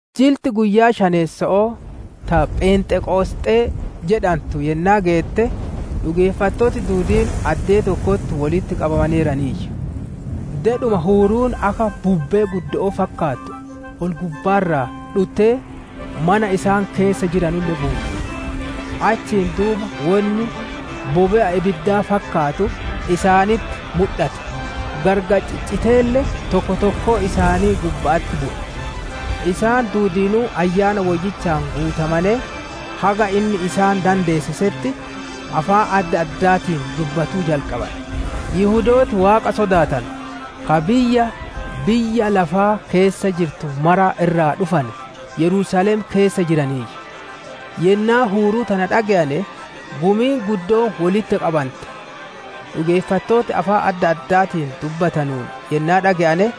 Jilti guyyaa shantameesso'oo ta «Phenxeqosxee» jedhantu yennaa geette, dhugeeffattooti duudiin addee tokkotti wolitti qabamaneeraniiyyu. Dedhuma huuruun akka bubbee guddo'oo fakkaattu ol-gubbaa irraa dhuttee, mana isaan keessa jiranulle guutte. Achiin duuba wonni bobe'a ibiddaa fakkaatu isaanitti mudhate; gargar cicciteelle tokko tokkoo isaanii gubba'atti bu'e. Isaan duudiinuu Ayyaana Woyyichaan guutamanee, haga inni isaan dandeessisetti afaan adda addaatiin dubbatuu jalqabane. Yihudooti Waaqa sodaatanu ka biyya biyya lafaa keessa jirtu mara irraa dhufane Yerusaalem keessa jiraniiyyu. Yennaa huuruu tana dhage'ane, gumiin guddoon wolitti qabante. Dhugeeffattooti afaan adda addaatiin dubbatanuun yennaa dhage'ane,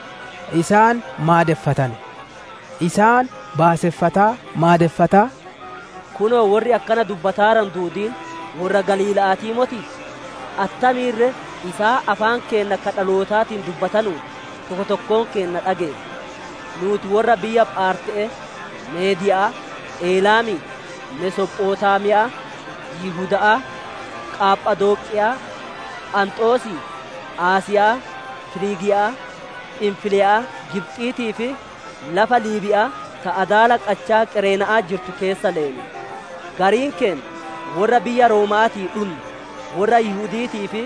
isaan maadeffatane. Isaan baaseffataa maadeffataa, «Kunoo worri akkana dubbataaranu duudiin worra Galiilla'aatii motii? Attamiin ree isaan afaan keenna ka dhalootaatiin dubbatanuun, tokko tokkoon keenna dhageenna? Nuuti worra biyya Phaarte'ee, Meediya'aa, Elaamii, Mesophotaamiya'aa, Yihuda'aa, Qaphadooqiya'aa, Phanxoosii, Asiya'aa, Firiigiya'aa, Phinfiliya'aa, Gibxiitii fi lafa Liibiya'aa ta adaala qachaa Qereena'aa jirtu keessa leenu; gariin keenna worra biyya Rooma'aatii dhunne, worra Yihudi'iitii fi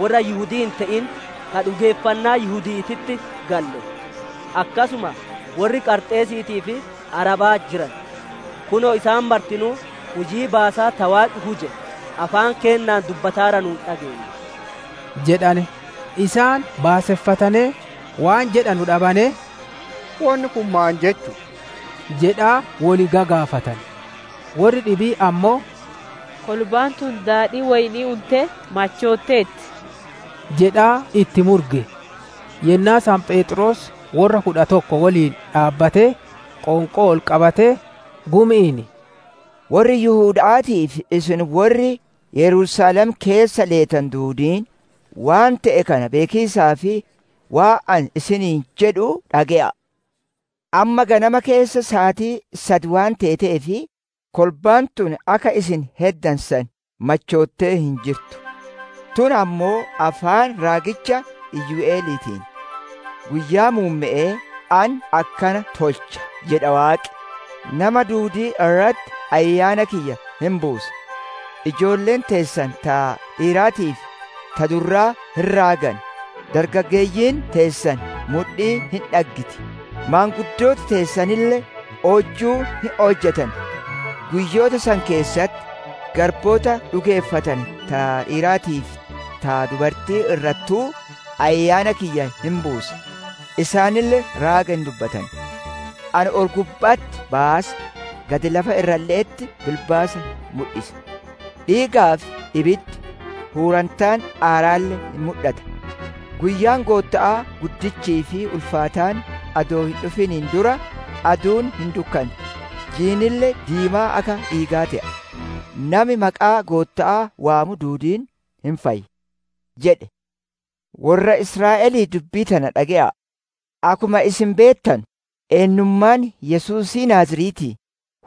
worra Yihudii hin te'in ka dhugeeffannaa Yihudi'iititti galle; akkasuma worri Qarxeesiitii fi Arabaa jiran; kunoo isaan martinuu hujii baasaa ta Waaqi huje afaan keennaan dubbataaranuun dhageenna» jedhane. Isaan baaseffatanee, waan jedhanu dhabanee, «Wonni kun maan jechu'u?» jedhaa wol gagaafatane. Worri dhibiin ammoo, «Kolbaan tun daadhii woyni'ii untee machootteerti!» jedhaa itti murge. Yennaa san Pheexroos worra kudha tokko woliin dhaabbatee qoonqoo ol qabatee, gumi'iin, «Worri Yihuda'aatii fi isin worri Yerusaalem keessa leetanu duudiin, waan te'e kana beekiisaaf waan ani isiniin jedhu dhage'a'a. Amma ganama keessa saatii sad waan teeteef, kolbaan tun akka isin heddane san machoottee hin jirtu. Tun ammoo afaan raagicha Yo'eliitiin, «‹Guyyaa muumme'ee ani akkana tolcha jedha Waaqi: nama duudii irratti Ayyaana kiyya hin buusa. Ijoolleen teessan ta dhiiraatii fi ta durraa hin raagan; dargaggeeyyiin teessan mudhii hin dhaggiti, Maanguddooti teessanille oojjuu hin oojjatan. Guyyoota san keessatti, garboota dhugeeffatane ta dhiiraatii fi ta dubarti'ii irrattuu, Ayyaana kiyya hin buusa; isaanille raaga hin dubbatan. Ani ol-gubba'atti baasa, gad lafa irralle'etti bilbaasa hin mudhisa; Dhiigaa fi ibiddi, hurrantaan aaraalle hin mudhata. Guyyaan Gootta'aa guddichii fi ulfaataan adoo hin dhufin dura, aduun hin dukkanti; jiinille diimaa akka dhiigaa te'a. Nami maqaa Gootta'aa waamu duudiin hin fayya› jedhe. «Worra Israa'elii dubbii tana dhage'a'a! Akkuma isin beettanu, eennummaan Yesuusii Naaziretii,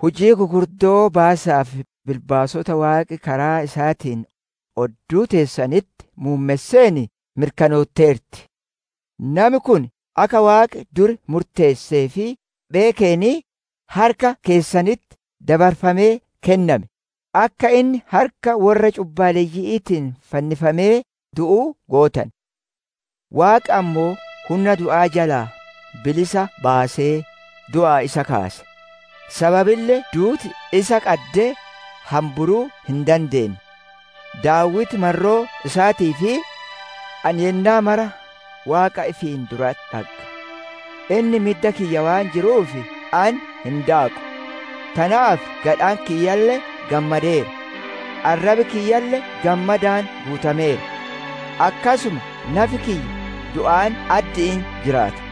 hujii gugurdoo baasaa fi bilbaasota Waaqi karaa isaatiin odduu teessanitti muummesseen mirkanootteerti. Nami kun akka Waaqi dur murteessee fi beekeen, harka keessanitti dabarfamee kenname; akka inni harka worra cubbaleyyi'iitiin fannifamee du'u gootane. Waaqi ammoo hunna du'aa jalaa bilisa baasee, du'aa isa kaase; sababille duuti isa qaddee hamburuu hin dandeenne. Daawiti marroo isaatiif, «‹Ani yennaa mara Waaqa ifiin duratti dhagga; Inni midda kiyya waan jiruuf ani hin daaqu. Tanaaf gadhaan kiyyalle gammadeera; arrabi kiyyalle gammadaan guutameera. Akkasuma nafi kiyya du'aan addi'iin jiraata.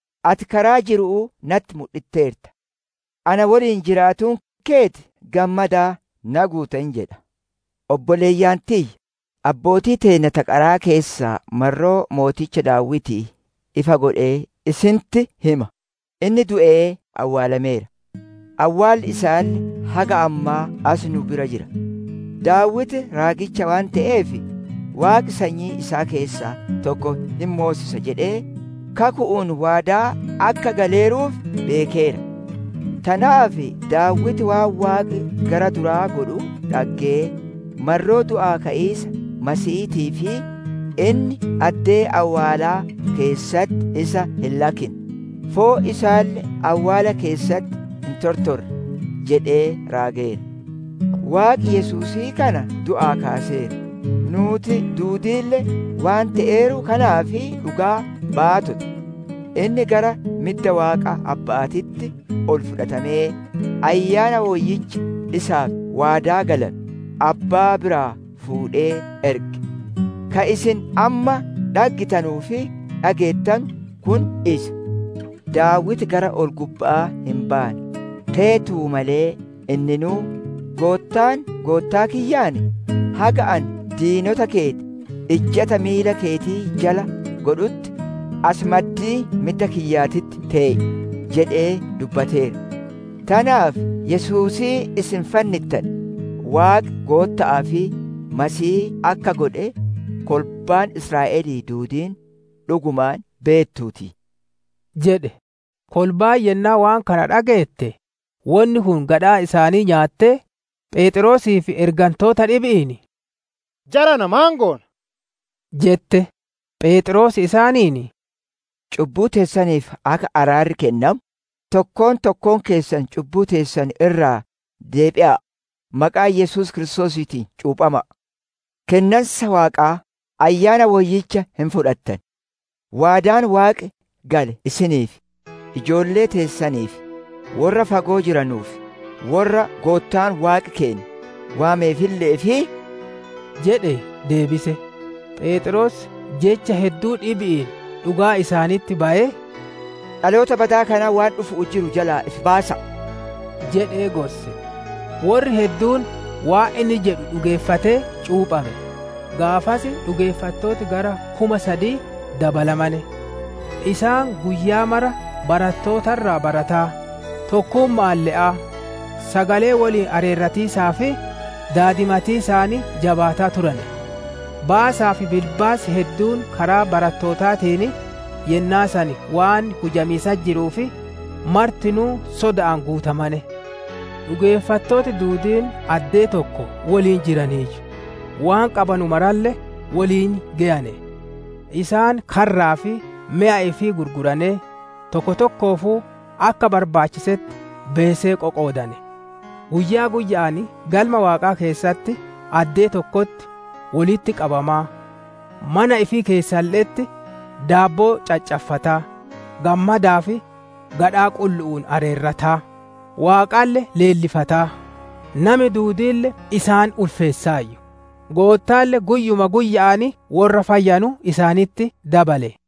Ati karaa jiru'uu natti mudhitteerta; Ana woliin jiraatuun keeti gammadaan na guutta› jedha. «Obboleeyyan tiyya, abbootii teenna ta qaraa keessaa marroo mooticha Daawitii ifa godhee isinitti hima. Inni du'ee awwaalameera; awwaalli isaalle haga ammaa asi nu'u bira jira. Daawiti raagicha waan te'eef, Waaqi sanyii isaa keessaa tokko hin moosisa jedhee kaku'uun waadaa akka galeeruuf beekeera. Tanaaf Daawiti waan Waaqi gara duraa godhu dhaggee, marroo du'aa ka'iisa Masiihiitiif, ‹Inni addee awwaalaa keessatti isa hin lakkinne; foon isaalle awwaala keessatti hin tortorre› jedhee raageera. Waaqi Yesuusii kana du'aa kaaseera; nuuti duudiille waan te'eeru kanaaf dhugaa baatota. Inni gara midda Waaqaa Abba'aatitti ol fudhatamee, Ayyaana Woyyicha isaaf waadaa galame, Abbaa biraa fuudhee erge; ka isin amma dhaggitanuu fi dhageettanu kun isa. Daawiti gara ol-gubba'aa hin baane; teetuu malee inninuu, «‹Goottaan Goottaa kiyyaan, haga ani diinota keeti ijjata miila keeti jala godhutti, asi maddii midda kiyyaatitti tee'i› jedhee dubbateera. «Tanaaf Yesuusii isin fannittane, Waaqi Gootta'aa fi Masiihii akka godhe kolbaan Israa'elii duudiin dhugumaan beettuu ti!» jedhe. Kolbaan yennaa waan kana dhageette, wonni kun gadhaa isaan nyaatee, Pheexroosii fi ergantoota dhibi'iin, «Jarana maan goona?» jette. Pheexroos isaaniin, «Cubbuu teessaniif akka araarri kennamu, tokkoon tokkoon keessan cubbuu teessan irraa deebitanee, maqaa Yesuus Kiristoosiitiin cuuphama'a; kennansa Waaqaa, Ayyaana Woyyicha hin fudhattan. Waadaan Waaqi gale isiniif, ijoollee teessaniif, worra fagoo jiranuu fi worra Goottaan Waaqi keenna waameefille'eef» jedhee deebise. Pheexroos jecha hedduu dhibi'iin dhugaa isaanitti bayee, «Dhaloota badaa kanatti waan dhufu'uu jiru jalaa ifi baasa'a» jedhe gorse. Worri hedduun waan inni jedhu dhugeeffatee cuuphame; gaafas dhugeeffattooti gara kuma sadii dabalamane. Isaan guyyaa mara barattoota irraa barataa, tokkumma'aan le'aa, sagalee woliin areerratiisaa fi daadimatiisaan jabaataa turane. Baasaa fi bilbaasi hedduun karaa barattootaatiin yennaa san waan hujamiisatti jiruuf, martinuu soda'aan guutamane. Dhugeeffattooti duudiin addee tokko woliin jiraniiyyu; waan qabanu maralle woliin geyane. Isaan karraa fi meya ifii gurguranee, tokko tokkoofuu akka barbaachittetti beesee qoqoodane. Guyyaa guyya'aan Galma Waaqaa keessatti addee tokkotti wolitti qabamaa mana ifii keessalle'etti daabboo caccaffataa, gammadaa fi gadhaa qullu'uun areerrataa, Waaqalle leellifataa, nami duudiille isaan ulfeessaayyu. Goottaalle guyyuma guyya'aan worra fayyanu isaanitti dabale.